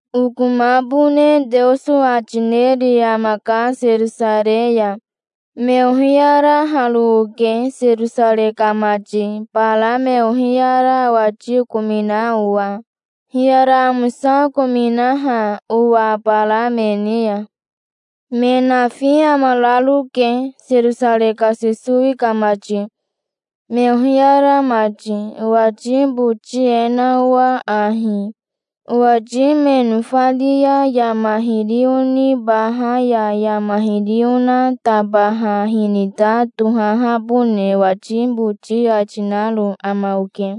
Okomabone Teoso ati neri amaka Serosarei ya. Me ohiyaraharo oke, Serosarei ka mati, bara me ohiyara owati okomina owa, hiyara amosa okominaha owa bara me ni ya. Me nafi amararoke, Serosarei ka Sesowi ka mati, me ohiyara mati, owati boti e na owa ahi: Owati me nofari ya yama hiri onibaha ya yama hiri ona tabaha hinita tohahabone owati boti ati naro ama oke.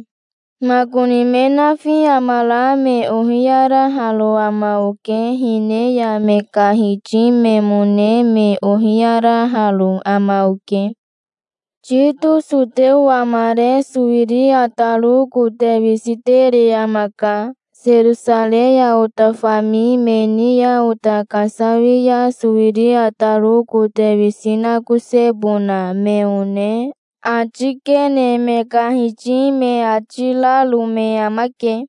Makoni me nafi amara me ohiyaraharo ama oke. Hine ya me ka hiti memone me ohiyaraharo ama oke. Tito soteo amare sowiri ataro kote wisi tere amaka. Serosarei ya ota fami me ni ya ota kasawia sowiri ataro kote wisi nakosebona me one ati kene me ka hiti me ati raro me amake.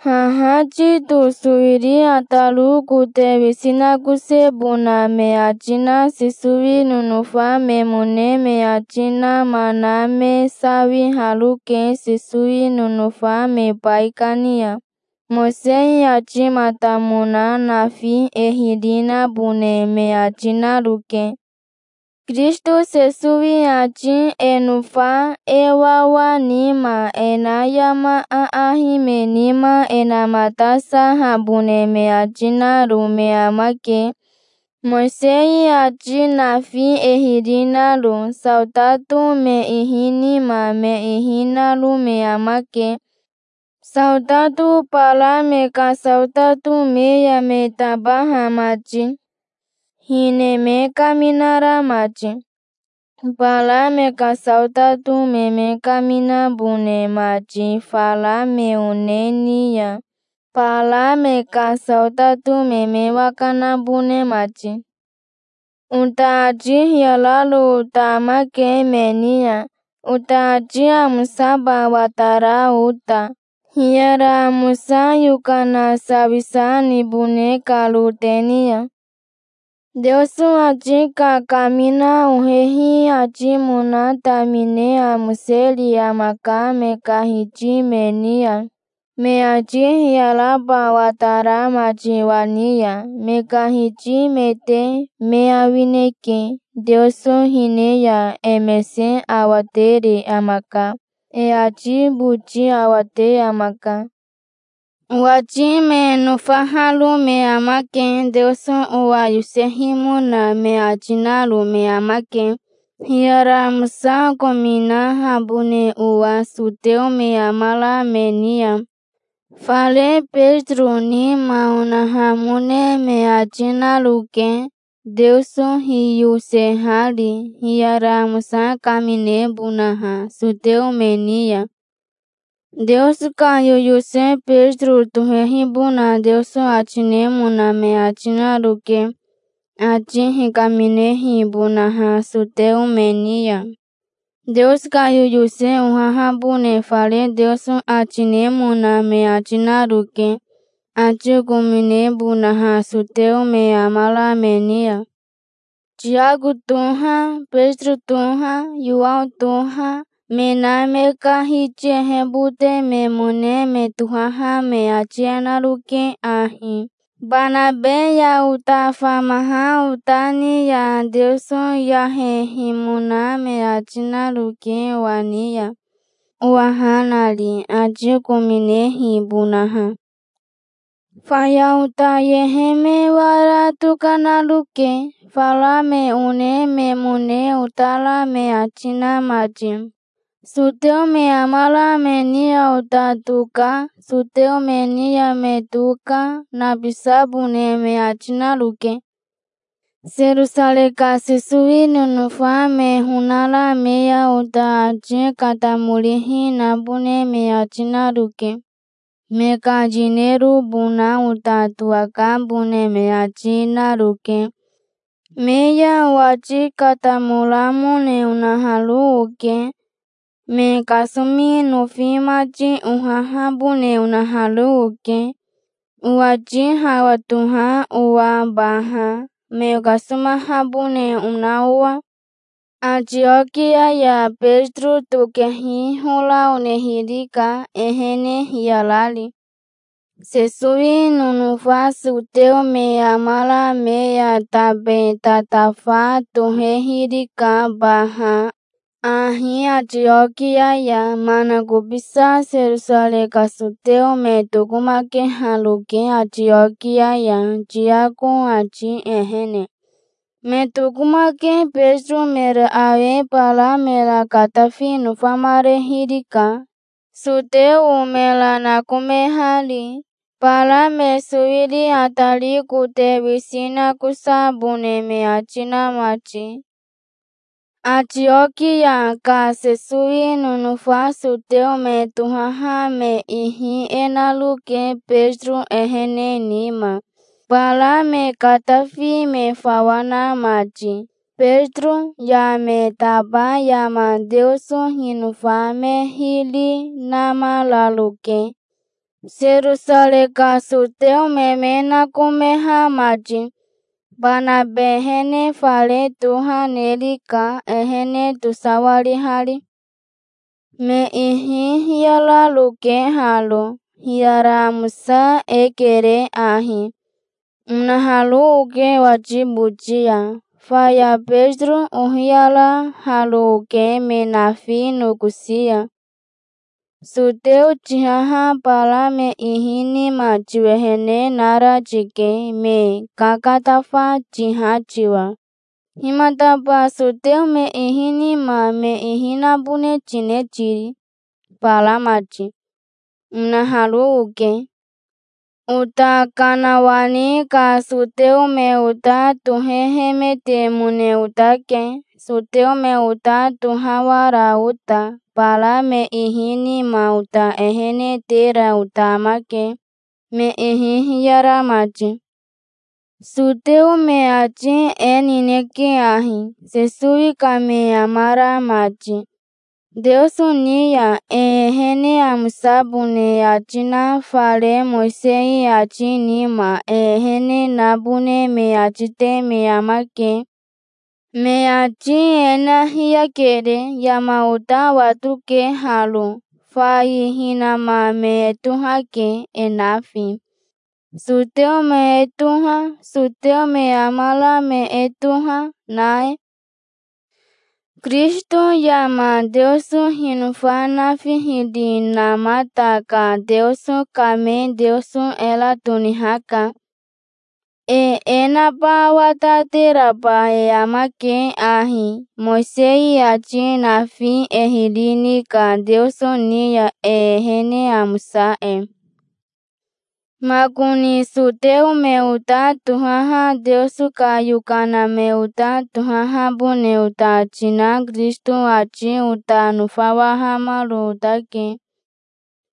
Haha Tito sowiri ataro kote wisi nakosebona me ati na Sesowi nonofa memone me ati nama na me sawiharoke Sesowi nonofa me baikani ya. Mowisei atimatamona nafi e hiri nabone me ati naroke. Kirisito Sesowi ati e nofa e wawa nima e na yama aahi me nima e namatasahabone me ati naro me amake, Mowisei ati nafi e hiri naro. Saotato me ihi nima me ihi naro me amake, saotato bara me ka saotato me ya me tabaha mati, hine me kaminara mati, bara me ka saotato me me kaminabone mati fara me one ni ya, bara me ka saotato me me waka nabone mati. Ota ati hiyararo ota amake me ni ya, ota ati amosaba watara ota, hiyara amosa yokana sawisa nibone karo te ni ya. Teoso ati kakamina ohehi atimona tamine amoseri amaka me ka hiti me ni ya, me ati hiyaraba watara mati owa ni ya. Me ka hiti mete me awineke. Teoso hine ya e mese awatere amaka. E ati boti awate amaka. Owati me nofaharo me amake. Teoso owa yosehimona me ati naro me amake, hiyara amosa okominahabone owa soteo me amara me ni ya. Fare Betiro nima onahamone me ati naroke, Teoso hiyosehari hiyara amosa kaminebonaha soteo me ni ya. Teoso ka yoyose Betiro tohehibona Teoso ati nemona me ati naroke, ati hikaminehibonaha soteo me ni ya. Teoso ka yoyose ohahabone fare Teoso ati nemona me ati naroke, ati okominebonaha soteo me amara me ni ya. Tiako toha, Betiro toha, Yowao toha, me na me ka hiti ehebote memone me tohaha me ati e naroke ahi Banabe ya ota famaha ota ni ya: Teoso yahehimona me ati naroke owa ni ya, owa ha nari, ati okominehibonaha. Faya ota yehe me wara tokanaroke, fara me one memone otara me ati na mati. Soteo me amara me ni ya ota toka, soteo me ni ya me toka, nabisabone me ati naroke. Serosarei ka Sesowi nonofa me honara me ya ota ati katamorihi nabone me ati naroke. Me ka yinerobona ota towakabone me ati naroke. Me ya owati katamoramone onaharo oke. Me kasomi nofi mati ohahabone onaharo oke, owati hawa toha owa baha, me okasomahabone ona owa. Atiokia ya Betiro tokehi hora onehirika, ehene hiyarari. Sesowi nonofa soteo me amara me ya tabe tatafa tohehirika baha ahi Atiokia ya. Manakobisa Serosarei ka soteo me tokomakeharoke Atiokia ya, Tiako ati ehene. Me tokomake Betiro mera awe bara mera katafi nofamarehirika, soteo mera nakomehari, bara me sowiri atari kote wisi nakosabone me ati na mati. Atiokia ka Sesowi nonofa soteo me tohaha me ihi e naroke Betiro ehene nima, bara me katafi me fawa na mati. Betiro ya me taba yama Teoso hinofa me hiri namararoke, Serosarei ka soteo me me nakomeha mati. Banabe ehene fare toha nerika, ehene tosawarihari. Me ihi hiyararoke haro. "Hiyara amosa e kere ahi", onaharo oke owati boti ya. Faya Betiro ohiyaraharo oke me nafi nokosi ya. "Soteo tihaha bara me ihi nima tiwehene nara tike, me kakatafa tiha tiwa. Himataba soteo me ihi nima me ihi nabone tine tiri, bara mati?" onaharo oke. Ota kanawani ka soteo me ota tohehemetemone otake, soteo me ota tohawara ota. Bara me ihi nima ota ehene tera ota amake, me ihi hiyara mati. Soteo me ati e nineke ahi, Sesowi ka me amara mati: Teoso ni ya e ehene amosabone e ati na fare Mowisei ati nima e ehene nabone me ati te me amake. Me ati e na hiyakere. Yama ota watoke haro. Fai hinama me e tohake, e nafi, soteo me e toha, soteo me amara me e toha, na e. Kirisito yama Teoso hinofa nafi hiri namata ka Teoso ka me Teoso era tonihaka. E e naba watateraba e amake ahi, Mowisei ati nafi e hiri ni ka Teoso ni ya e ehene amosa e. Makoni soteo me ota tohaha Teoso ka yokana me ota tohahabone ota ati na Kirisito ati ota nofawahamaro otake,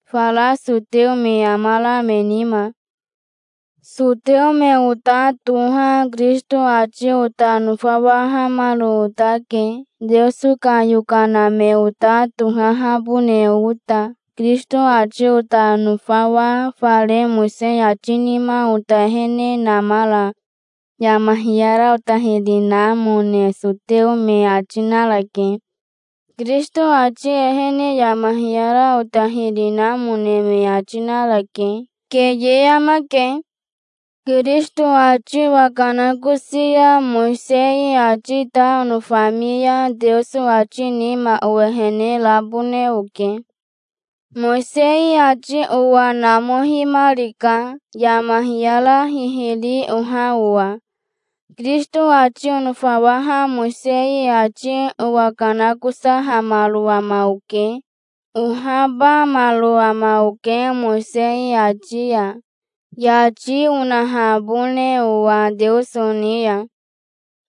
fara soteo me amara me nima. Soteo me ota toha Kirisito ati ota nofawahamaro otake, Teoso ka yokana me ota tohahabone ota. Kirisito ati ota nofawa fare Mowisei ati nima ota ehene namara yama hiyara ota hiri namone soteo me ati narake. Kirisito ati ehene yama hiyara ota hiri namone me ati narake. Keye amake. Kirisito ati owakanakosi ya Mowisei ati ta onofami ya Teoso ati nima owehene rabone oke. Mowisei ati owa namohimarika, yama hiyara hihiri oha owa. Kirisito ati onofawaha Mowisei ati owakanakosahamaro ama oke. Ohabamaro ama oke Mowisei ati ya, yati onahabone owa Teoso ni ya.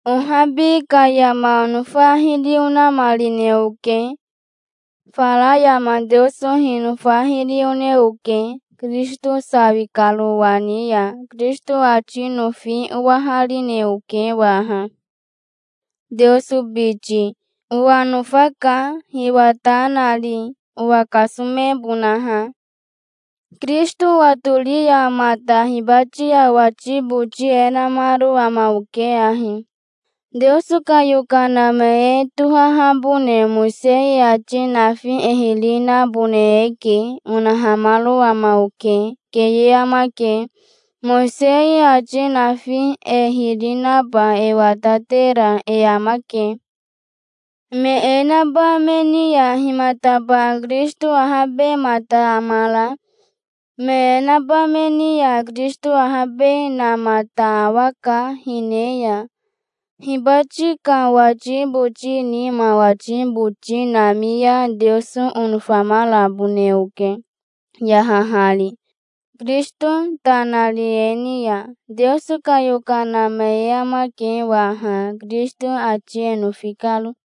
Ohabi ka yama onofa hiri onamarine oke. Fara yama Teoso hinofa hiri one oke, Kirisito sawi karo owa ni ya. Kirisito ati nofi owaharine oke waha, Teoso biti. Owa nofaka, hiwa ta nari, owa kasomebonaha. Kirisito owatori ya mata hibati ya owati boti e namaro ama oke ahi: "Teoso ka yokana me e tohahabone Mowisei ati nafi e hiri nabone eke", onahamaro ama oke. Keye amake. Mowisei ati nafi e hiri naba e watatera e amake. Me e naba me ni ya himataba Kirisito ahabemata amara? Me e naba me ni ya Kirisito ahabenamata awaka hine ya. Hibati ka owati boti nima owati boti nami ya Teoso onofamarabone oke, yahahari, Kirisito ta nari e ni ya. Teoso ka yokana me e amake waha, Kirisito ati e nofi karo.